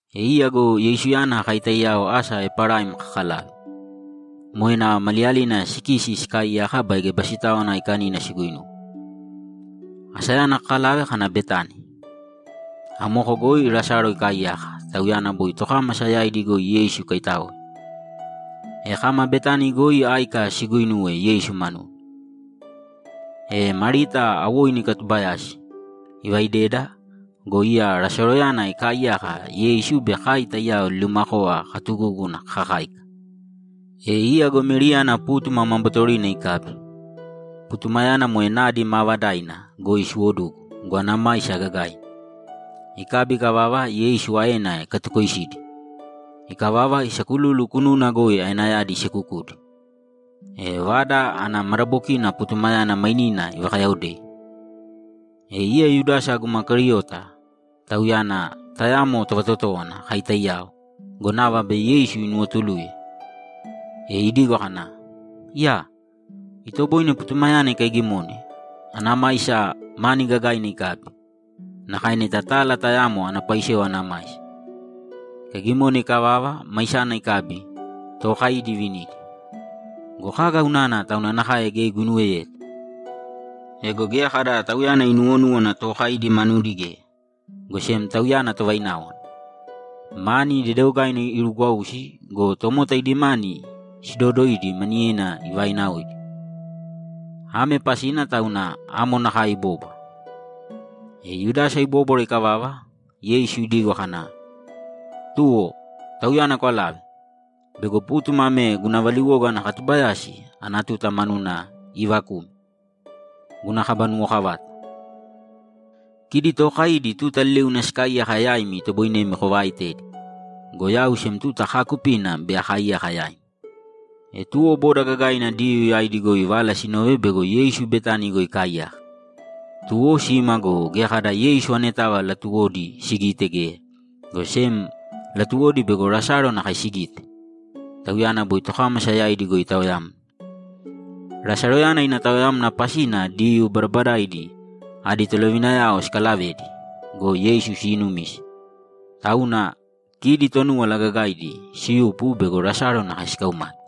E iya go Yeisuyana kai taiyao asa Eparaim kakalave. Moe nava maliyalina sikisi sikaaiyaka baige Basitáwana Aikanina siguinuwe. Asayana kakalave kana Betani. Amoko goi Lasalo ikaaiyaka, tauyana boi tokámasa yaidi goi Yeisu ikaitáoe. E kama Betani goi áika siguinuwe Yeisu manuna. E Marita awoinu ikatubayasi, ivaideda go, iya Lasaloyana ikaaiyaka, Yeisu be kai taiyao liliumakova katugúguna kakakáika. E iya go Meriyana pútuma ma bootorina ikabi; putumayana moe nadi maavadaina goi siwodugu go, ana maisa gagaina. Ikabi ikavava, Yeisu aena ikatukoisidi. Ikavava, isakululu kununa goi aenayadi isekukudi. E vada ana madabokina putumayana mainina ivakayaodei. E iya Yudasa guma Keriota, tauyana tayamo tovatotówana kai taiyao go, nava bei Yeisu inuwotuluye. E idigo kana, ‘Iyaa! Itoboine putumayana ikaigimone, ana maisa mani gagaina ikabi; nakae neta tala tayamo ana paisewa ana maisa. Ikaigimone ikavava, maisana ikabi, tookaidi ivinidi. Go kaga unana tauna nakae geya iguinuweyeta?’ Ego geya kada tauyana inuwonúwana tookaidi manudi geya, go sem tauyana tovaináwana. Mani dedeogaina irugwausi go, tomota idi mani siidodoidi maniyedi ivainaoidi. Ame pasina tauna amo nakae ibóbwara. E Yudasa ibóbwara ikavava, Yeisu idigo kana, ‘Tuwo, tauyana kwalāve! Bego pútuma ame guna valiwoga ana katubayasi ana tuta manuna iivakume, guna kaba nuwokavata. Kidi tookaidi tuta liliuna sikaaiyaka yaimi itoboinemi kovaaitedi. Go yau sem tuta kaakupina bei akaaiyaka yaimi.’ E tuwo boda gagaina Diyuu yaidi goi vala sinove bego Yeisu Betani goi ikaaiyaka, tuwo sima go, geya kada Yeisu anetava latuwodi sigite geya, go sem latuwodi bego Lasalo nakae sigite. Tauyana boi tokámasa yaidi goi itaoyamna. Lasaloyana ina taoyamna pasina Diyuu badabadaidi adi tolovinayao sikalavedi go, Yeisu siinumise. Tauna kidi Tonúwala Gagaidi siyupu bego Lasalo nakae sikaumate.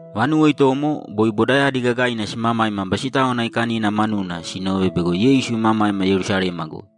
Vanuwo itomo, boi bodayadi gagaina simamaima Basitáwana Aikanina manuna sinove bego Yeisu imamaima Yerusalema goi.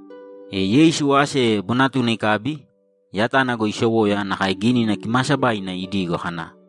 E Yeisu ase bonatuna ikabi, yatana goi isowoya nakae Gínina Kimaasabaina idigo kana,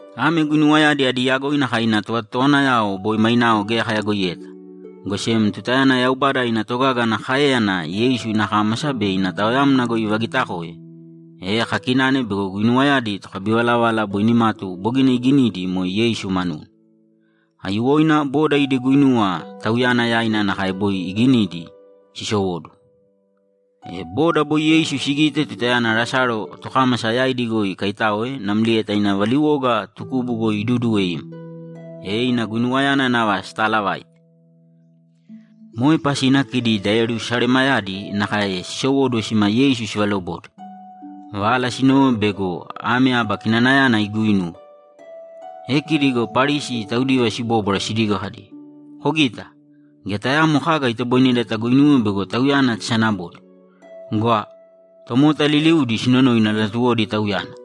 Ame guinuwayadi adi yagoina kai ina tovatotowanayao boi mainao geya kayagoiyeta, go sem tutayana Yaubada ina togaga ana káeyana Yeisu ina kámasa be ina taoyamna goi ivagitakoe, e kakinane bego guinuwayadi tokabivalavala boi nimatu bogina iginidi moe Yeisu manuna. Aiyuwoina boda idi guinuwa Tauyana yaina nakae boi iginidi sisowóduwo. E boda boi Yeisu sigite tutayana Lasalo tokámasa yaidi goi ikaitáoe namlieta ina valiwoga tukubu goi iduduwe ima, e ina guinuwayana nava sitaalavaite. Moe pasina kidi da Yerusalemayadi nakae sisowóduwo sima Yeisu sivalobode. Vala sinove bego ame aba kinanayana iguinuwe. E kidi go Parisi taudiva sibóbwara sidigo kadi, ‘Kogīta! Geya tayaamo kaga itoboineda taguinuwe bego Tauyana tasanabode. Gwa! Tomota liliudi sinonoina latuwodi Tauyana!’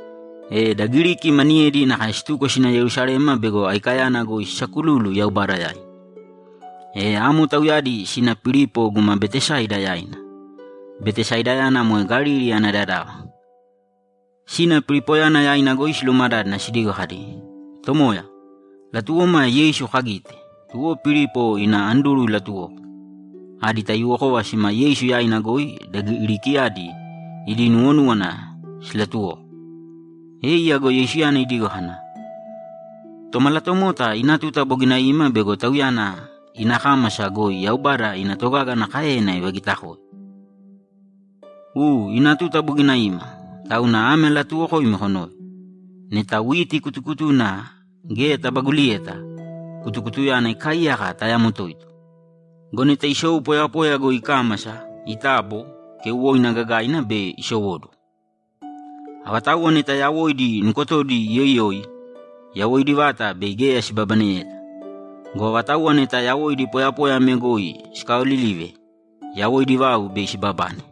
E da Giriki maniyedi nakae situko sina Yerusalema bego Aikayana goi sisakululu Yaubada yaina. E amo tauyadi sina Pilipo guma Betesaida yaina. Betesaidayana moe Galili ana dadava. Sina Pilipoyana yaina goi silumadádana sidigo kadi, ‘Tomoya, latuwoma Yeisu kagite.’ Tuwo Pilipo ina Anduru ilatuwoko. Adi taiyuwokova sima Yeisu yaina goi da Girikiyadi idi nuwonúwana silatuwoko. E iya go Yeisuyana idigo kana, ‘Tomalatomota ina tuta bogina ima bego Tauyana ina kámasa goi Yaubada ina togaga ana káeyana ivagitakoe. U, ina tuta bogina ima, tauna ame alatuuwokoimi konōve: Neta witi kutukutuna geya tabaguliyeta, kutukutuyana ikaaiyaka tayamo toito. Go neta isou poyapoya goi ikámasa, itabo, keuwoina gagaina bei isowóduwo. Avatauwa neta yawoidi nukotodi iyoiyoi, yawoidi vata bei geya sibabaneyeta. Go avatauwa neta yawoidi poyapoya ame goi sikaaolilive, yawoidi vau bei sibabane.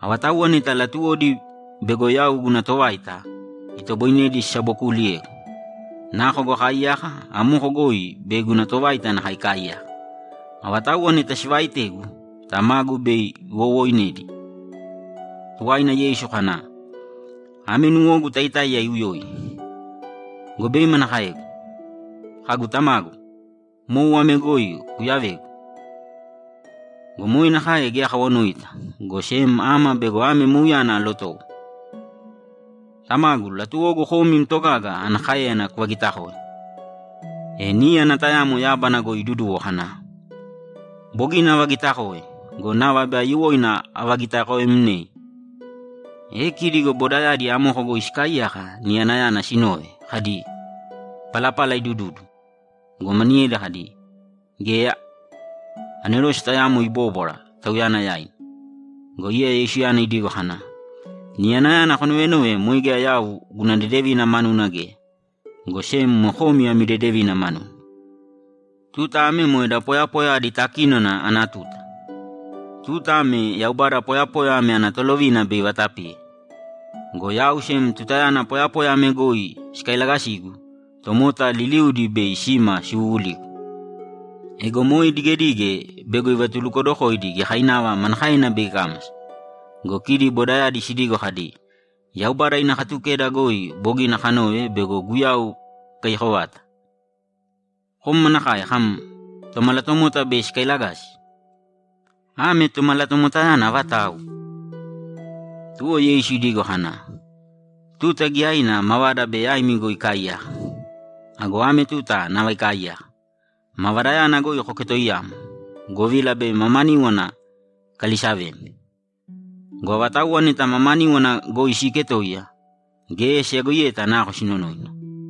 Avatauwa neta latuwodi bego yau guna tovaita, itoboine sisabokuuliyegu. Nako goi akaaiyaka, amoko goi bei guna tovaita nakae ikaaiyaka. Avatauwa neta sivaaitegu, Tamagu bei iwowooinedi.’ Tuwaina Yeisu kana, ‘Ame nuwogu taitáiya iuyoi. Go bei manakaegu? Kagu, “Tamagu, mou ame goi kuyavēgu”? Go moe nakae geya akawanoita, go sem ama bego ame mouyana alotowo. Tamagu, latuwogu kom im togaga ana káeyana kuvagitakōe.’ E níyana tayamo yábana goi iduduwo kana, ‘Bogina avagitakoe go, nava bei aiyuwoina avagitakoemnei.’ E kidi go bodayadi amoko goi sikaaiyaka, niyanayana sinove kadi, ‘Palapala idududu.’ Go maniyedi kadi, ‘Geya. Anerose tayamo ibóbwara Tauyana yaina.’ Go iya Yeisuyana idigo kana, ‘Niyanayana konovenove moe geya yau guna dedevina manuna geya, go sem moe komi ami dedevina manuna. Tuta ame moe da poyapoya adi takínona ana tuta. Tuta ame Yaubada poyapoya ame ana tolovina bei ivatapiye. Go yau sem tutayana poyapoya ame goi sikailagasigu, tomota liliudi bei sima siwuwuligu.’ Ego moe idigedige bego ivatulukodokoidi giyakainava manakaena bei ikámasa. Go kidi bodayadi sidigo kadi, ‘Yaubada ina Katukeda goi bogina kanove bego Guyau ikaiyako vata. Kom manakae kam, “Tomalatomota bei sikailagasi”? Ame Tomalatomotayana avatau?’ Tuwo Yeisu idigo kana, ‘Tuta giyaina mavada bei yaimi goi ikaaiyaka. Go ame tuta nava ikaaiyaka; mavadayana goi koketoiyāmo, govila bei mamaníwana ikalisavemi. Go avatauwa neta mamaníwana goi siiketoiya, geya siyagoiyeta nako sinonoina.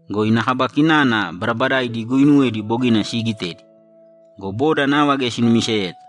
Go ina kaba kinana badabadaaidi iguuinuwedi bogina siigitedi go, boda nava geya sinumiseyeta.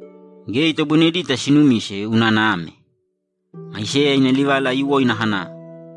Geya itoboinedita sinumise unana ame: Aiseya ina livala aiyuwoina kana,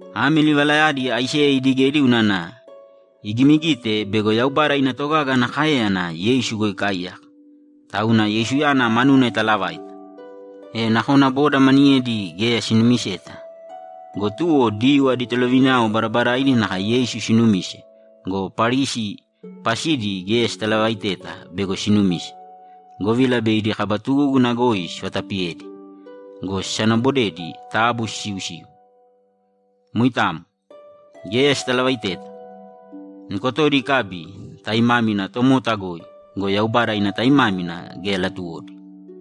Ame livalayadi Aiseya idigedi unana igimigite bego Yaubada ina togaga ana káeyana Yeisu goi ikaaiyaka, tauna Yeisuyana manuna italavaita. E nakona boda maniyedi geya sinumiseta go, tuwo Diyuu adi tolovinayao badabadaaidi nakae Yeisu sinumise go, Parisi pasidi geya sitalavaiteta bego sinumise, govila bei idi kaba tugúguna goi sivatapiyedi go, sisanabodedi taabu sisiusīu. Moitamo. Geya sitalavaiteta. Nukotodi ikabi taimámina tomota goi go, Yaubada ina taimámina geya latuwodi.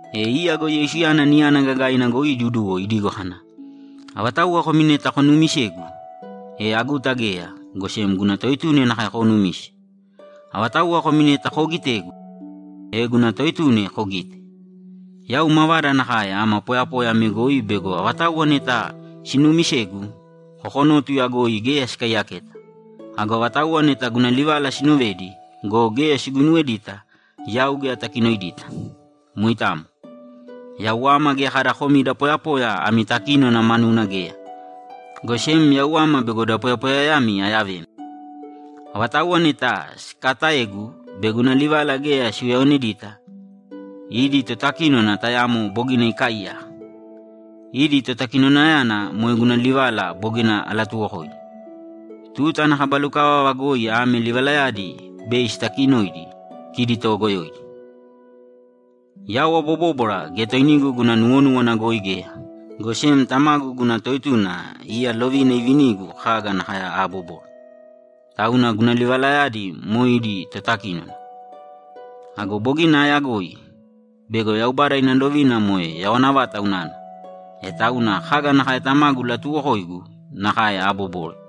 E iya go Yeisuyana niyana gagaina goi iduduwo idigo kana, ‘Avatauwa komi neta konuumisegu, e aguta geya, go sem guna Toetuna nakae koonumise. Avatauwa komi neta koogitegu, e guna Toetuna kogite. Yau mavada nakae ama poyapoya ame goi bego avatauwa neta sinuumisegu, kokonótuya goi geya sikaiyaketa. Ago avatauwa neta guna livala sinovedi go, geya siguinuwedita, yau geya atakinoidita. Moitamo. Yau ama geya kada komi da poyapoya ami takínona manuna geya, go sem yau ama bego da poyapoyayami ayavemi. Avatauwa neta sikaataegu be guna livala geya siuyaonedita, idi totakínona tayamo bogina ikaaiyaka. Idi totakinonayana moe guna livala bogina alatuwokoidi. Tuta ana kaba lukavava goi ame livalayadi bei sitakinoidi kidi toogoyoidi. Yau abobóbwara geya toinigu guna nuwonúwana goi geya, go sem Tamagu guna Toetuna iya lovina ivinigu kaga nakae aabobore. Tauna guna livalayadi moe idi totakínona. Ago bogina aayagoi bego Yaubada ina lovina moe yawana vata unana. E tauna kaga nakae Tamagu ilatuuwokoigu, nakae aabobore.’